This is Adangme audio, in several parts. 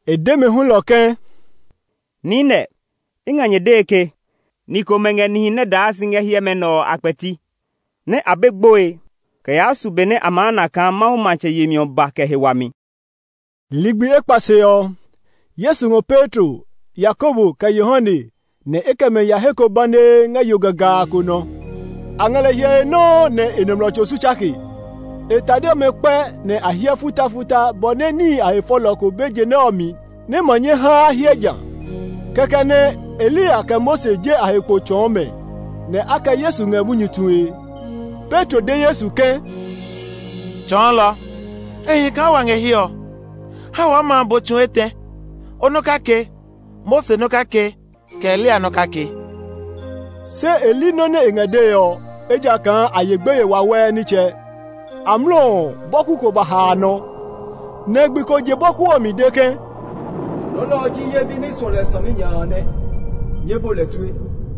E de mɛ hulɔ ke, “Niinɛ i ngɛ nyɛ dee ke ni komɛ ngɛ nihi nɛ daa si ngɛ hiɛmɛ nɛ ɔ a kpɛti nɛ a be gboe kɛ yaa su be nɛ a maa na kaa Mawu matsɛ yemi ɔ ba kɛ he wami.” Ligbi ekpa se ɔ, Yesu ngɔ Petro, Yakobo, kɛ Yohane; nɛ e kɛ mɛ ya he ko banee ngɛ yo gagaa ko nɔ. A ngɛ lɛ hyɛe nɔuu nɛ e nɔmlɔ tso su tsake. E tade ɔmɛ kpɛ nɛ a hiɛ futafuta bɔ nɛ níhi a he fɔlɔ ko be je nɛ ɔ mi nɛ ma nyɛ ha a hiɛ ja. Kɛkɛ nɛ Eliya kɛ Mose je a he kpo tsɔɔ mɛ nɛ a kɛ Yesu ngɛ munyu tue. Petro de Yesu ke, “Tsɔɔlɔ, e hi kaa wa ngɛ hiɛ ɔ. Ha waa ma bo tsu etɛ, o nɔ kake, Mose nɔ kake, kɛ Eliya nɔ kake.” Se e li nɔ́ nɛ e ngɛ dee ɔ, ejakaa a ye gbeye wawɛɛ nitsɛ. Amlɔ ɔ, bɔku ko ba ha a nɔ, nɛ gbi ko je bɔku ɔ mi de ke, “Nɔ nɛ ɔ ji ye bi nɛ i suɔ lɛ saminya a nɛ; nyɛɛ bu lɛ tue!”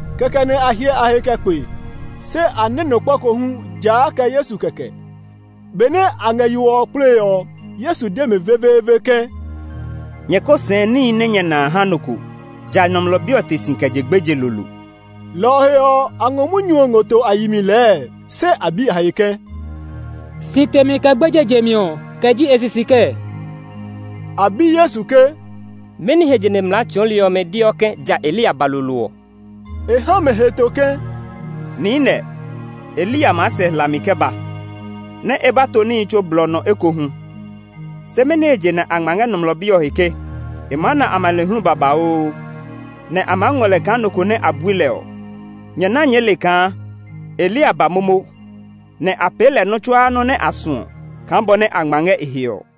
Kɛkɛ nɛ a hyɛ a he kɛ kpe, se a nɛ́ nɔ kpa ko hu, ja a kɛ Yesu kɛkɛ. Benɛ a ngɛ yo ɔ kplee ɔ, Yesu de mɛ veveeve ke, “Nyɛ ko sɛɛ níhi nɛ nyɛ na a ha nɔ ko, ja Nɔmlɔ Bi ɔ te si kɛ je gbeje lolo.” Lɔ ɔ he ɔ, a ngɔ munyu ɔ ngɔ to a yi mi lɛɛ, se a bi a he ke, “Si temi kɛ gbeje jemi ɔ, kɛ ji e sisi kɛɛ?” A bi Yesu ke, “Mɛni he je nɛ mlaa tsɔɔli ɔmɛ deɔ ke ja Eliya ba lolo ɔ?” E ha mɛ heto ke, “Niinɛ, Eliya maa sɛ hlami kɛ ba nɛ e ba to níhi tsuo blɔ nɔ ekohu. Se mɛni he je a ngma ngɛ Nɔmlɔ Bi ɔ he ke e maa na amanehlu babauu, nɛ a maa ngɔ lɛ kaa nɔ ko nɛ a bui lɛ ɔ? Nyɛ ná nyɛɛ le kaa Eliya ba momo, nɛ a pee lɛ nɔ́ tsuaa nɔ́ nɛ a suɔ kaa bɔ nɛ a ngma ngɛ e he ɔ.”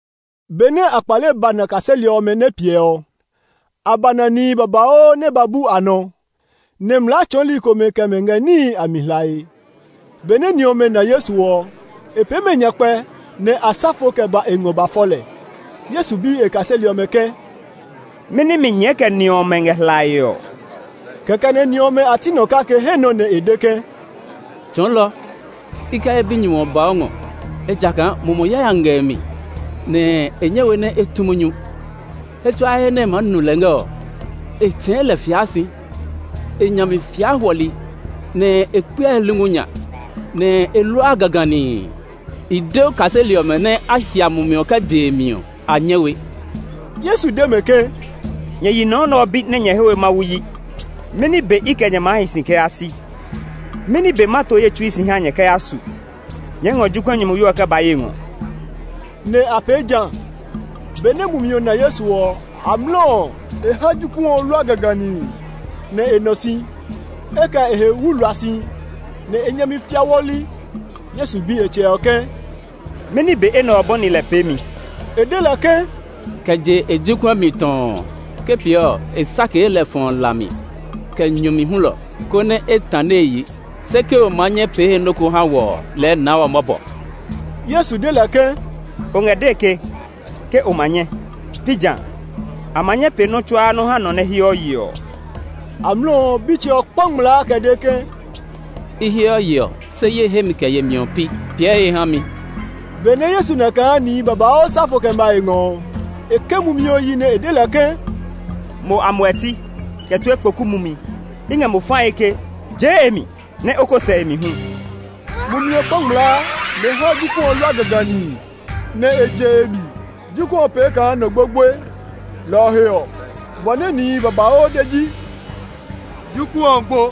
Benɛ a kpale ba na kaseli ɔmɛ nɛ piɛ ɔ, a ba na nihi babauu nɛ ba bu a nɔ, nɛ mlaa tsɔɔli komɛ kɛ mɛ ngɛ níhi a mi hlae. Benɛ ni ɔmɛ na Yesu ɔ, e pee mɛ nyakpɛ, nɛ a sa fo kɛ ba e ngɔ ba fɔ lɛ. Yesu bi e kaseli ɔmɛ ke, “Mɛni mi nyɛɛ kɛ ni ɔmɛ ngɛ hlae ɔ?” Kɛkɛ nɛ ni ɔmɛ a ti nɔ kake he nɔ nɛ e de ke, “Tsɔɔlɔ, i kɛ ye binyumu ba o ngɔ, ejakaa mumi yayami ngɛ e mi, nɛ e nyɛ we nɛ e tu munyu. He tsuaa he nɛ e maa nu lɛ ngɛ ɔ, e tsɛ̃ɛ̃ lɛ fiaa si; e nya mi fiaa hwɔli, nɛ e kpeɔ e lungu nya, nɛ e luaa gaganii. I de o kaseli ɔmɛ nɛ a hia mumi ɔ kɛ je e mi ɔ, a nyɛ we.” Yesu de mɛ ke, “Nyɛ yi nɔ nɛ ɔ bi nɛ nyɛ he we Mawu yi! Mɛni be i kɛ nyɛ maa hi si kɛ yaa si? Mɛni be ma to ye tsui si ha nyɛ kɛ ya su? Nyɛɛ ngɔ jokuɛ nyumuyo ɔ kɛ ba ye ngɔ.” Nɛ a pee ja. Benɛ mumi ɔ na Yesu ɔ, amlɔ ɔ, e ha jokuɛ ɔ lua gaganii, nɛ e nɔ si. E kɛ e he wuwlua si, nɛ e nya mi fia hwɔli. Yesu bi e tsɛ ɔ ke, “Mɛni be enɛ ɔ bɔni lɛ peemi?” E de lɛ ke, “Kɛ je e jokuɛ mi tɔɔ. Ke pee ɔ, e sakee lɛ fɔɔ la mi, kɛ nyu mi hulɔ, konɛ e tane e yi. Se ke o ma nyɛ pee he nɔ́ ko ha wɔ ɔ, lɛɛ naa wɔ mɔbɔ!” Yesu de lɛ ke, “O ngɛ dee ke, Ke o ma nyɛ, pi jã a? A ma nyɛ pee nɔ́ tsuaa nɔ́ ha nɔ nɛ heɔ yeɔ ɔ!” Amlɔ ɔ, bitsɛ ɔ kpa ngmlaa kɛ de ke, “I heɔ yeɔ, se ye hemi kɛ yemi ɔ pi. Piɛ he ha mi!” Benɛ Yesu na kaa nihi babauu sa fo kɛ ma e ngɔ ɔ, e ke mumi ɔ yi nɛ e de lɛ ke, “Mo amuɛti kɛ tue kpoku mumi, i ngɛ mo fae ke, jee e mi, nɛ o ko sɛ e mi hu!” Mumi ɔ kpa ngmlaa, nɛ e ha jokuɛ ɔ lua gaganii, nɛ e je e mi. Jokuɛ ɔ pee kaa nɔ gbogboe. Lɔ ɔ he ɔ, bɔ nɛ nihi babauu de ji, “Jokuɛ ɔ gbo.”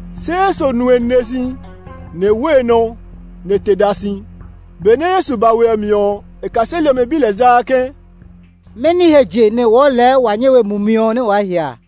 Se Yesu nu e nine si, nɛ e wo e nɔ, nɛ e te da si. Benɛ Yesu ba we mi ɔ, e kaseli ɔmɛ bi lɛ zaa ke, “Mɛni he je nɛ wɔɔ lɛɛ wa nyɛ we mumi ɔ nɛ waa hia a?”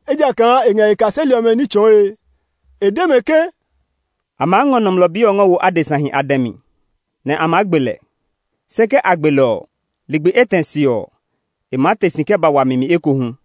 ejakaa e ngɛ e kaseli ɔmɛ ní tsɔɔe. E de mɛ ke, “A maa ngɔ Nɔmlɔ Bi ɔ ngɔ wo adesahi a dɛ mi, nɛ a maa gbe lɛ. Se ke a gbe lɛ ɔ, ligbi etɛ se ɔ, e maa te si kɛ ba wami mi ekohu.”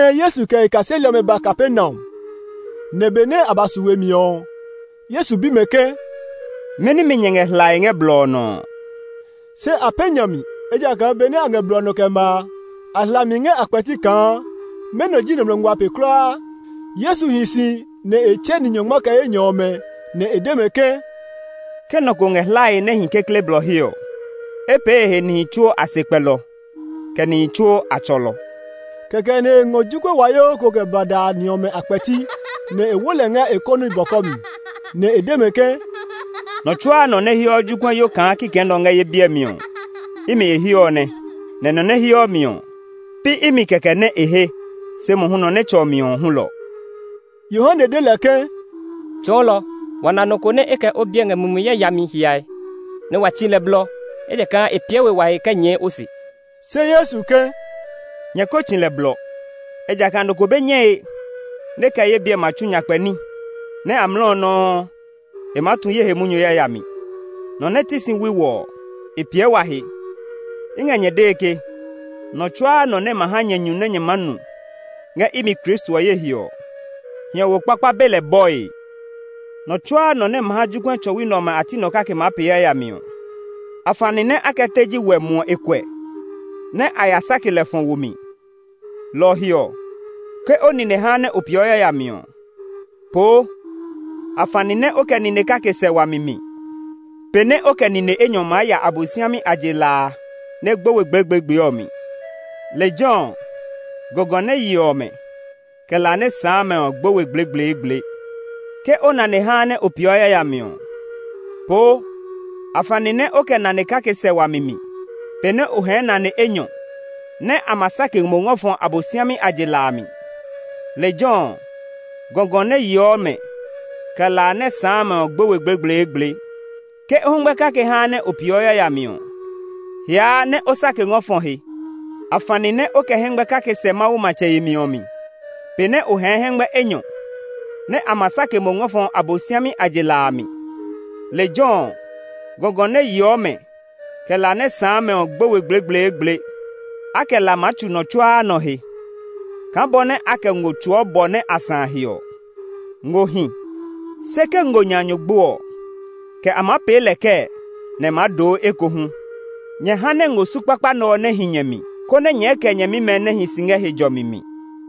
Jehanɛ Yesu kɛ e kaseli ɔmɛ ba Kapernaum; nɛ benɛ a ba su we mi ɔ, Yesu bi mɛ ke, “Mɛni mi nyɛ ngɛ hlae ngɛ blɔ ɔ nɔ ɔ?” Se a pɛ̃ nya mi, ejakaa benɛ a ngɛ blɔ ɔ nɔ kɛ ma a, a hla mi ngɛ a kpɛti kaa mɛnɔ ji nɔmlɔ ngua pe kulaa. Yesu hi si nɛ e tsɛ ni nyɔngma kɛ enyɔ ɔmɛ, nɛ e de mɛ ke, “Ke nɔ ko ngɛ hlae nɛ e hi kekle blɔ he ɔ, e pee e he nihi tsuo a sekpɛlɔ, kɛ nihi tsuo a tsɔlɔ.” Kɛkɛ nɛ e ngɔ jokuɛ wayoo ko kɛ ba da ni ɔmɛ a kpɛti, nɛ e wo lɛ ngɛ e kɔni bɔkɔ mi, nɛ e de mɛ ke, “Nɔ tsuaa nɔ nɛ heɔ jokuɛyo kaa kikɛ nɛ ɔ ngɛ ye biɛ mi ɔ, imi e he ɔ nɛ; nɛ nɔ nɛ heɔ mi ɔ, pi imi kɛkɛ nɛ e he, se mohu nɔ nɛ tsɔ mi ɔ hulɔ.” Yohane de lɛ ke, “Tsɔɔlɔ, wa na nɔ ko nɛ e kɛ o biɛ ngɛ mumi yayami hiae, nɛ wa tsi lɛ blɔ, ejakaa e piɛ we wa he kɛ nyɛɛ o se.” Se Yesu ke, “Nyɛ ko tsi lɛ blɔ, ejakaa nɔ ko be nyɛe nɛ e kɛ ye biɛ ma tsu nyakpɛ ní nɛ amlɔ nɔuu ɔ e maa tu ye he munyu yayami. Nɔ nɛ ti si wui wɔ ɔ, e piɛ wa he. I ngɛ nyɛ dee ke, nɔ tsuaa nɔ nɛ ma ha nyɛ nyu nɛ nyɛ maa nu ngɛ imi Kristo ɔ ye he ɔ, hiɔwo kpakpa be lɛ bɔe. “Nɔ tsuaa nɔ nɛ ma ha jokuɛ tsɔwi nɛ ɔmɛ a ti nɔ kake maa pee yayami ɔ, afani nɛ a kɛ teji wɛ muɔ e kuɛ, nɛ a ya sake lɛ fɔ wo mi. Lɔ ɔ he ɔ, ke o nine haa nɛ o peeɔ yayami ɔ, poo; afani nɛ o kɛ nine kake sɛ wami mi pe nɛ o kɛ nine enyɔ maa ya Abosiami a je la a nɛ gbo we gblegbleegble ɔ mi. [ Lejɛ ɔ, ‘gɔgɔ nɛ yeɔ mɛ, kɛ la nɛ sãã mɛ ɔ gbo we gblegbleegble.’] Ke o nane haa nɛ o peeɔ yayami ɔ, poo; afani nɛ o kɛ nane kake sɛ wami mi pe nɛ o hɛɛ nane enyɔ nɛ a ma sake mo ngɔ fɔ Abosiami a je la a mi. [ Lejɛ ɔ, ‘gɔgɔ nɛ yeɔ mɛ, kɛ la nɛ sãã mɛ ɔ gbo we gblegbleegble.’] Ke o hɛngmɛ kake haa nɛ o peeɔ yayami ɔ, hiaa nɛ o sake ngɔ fɔ he; afani nɛ o kɛ hɛngmɛ kake sɛ Mawu matsɛ yemi ɔ mi pe nɛ o hɛɛ hɛngmɛ enyɔ nɛ a ma sake mo ngɔ fɔ Abosiami a je la a mi. Lejɛ ɔ, ‘gɔgɔ nɛ yeɔ mɛ, kɛ la nɛ sãã mɛ ɔ gbo we gblegbleegble.’ “A kɛ la maa tsu nɔ tsuaa nɔ he kaa bɔ nɛ a kɛ ngo tsuu bɔ nɛ a sã he ɔ. “Ngo hi, se ke ngo nya nyu gbo ɔ, kɛ a maa pee lɛ kɛɛ nɛ e maa doo ekohu? Nyɛ ha nɛ ngo su kpakpa nɛ ɔ nɛ hi nyɛ mi, konɛ nyɛɛ kɛ nyɛmimɛ nɛ hi si ngɛ he jɔmi mi.”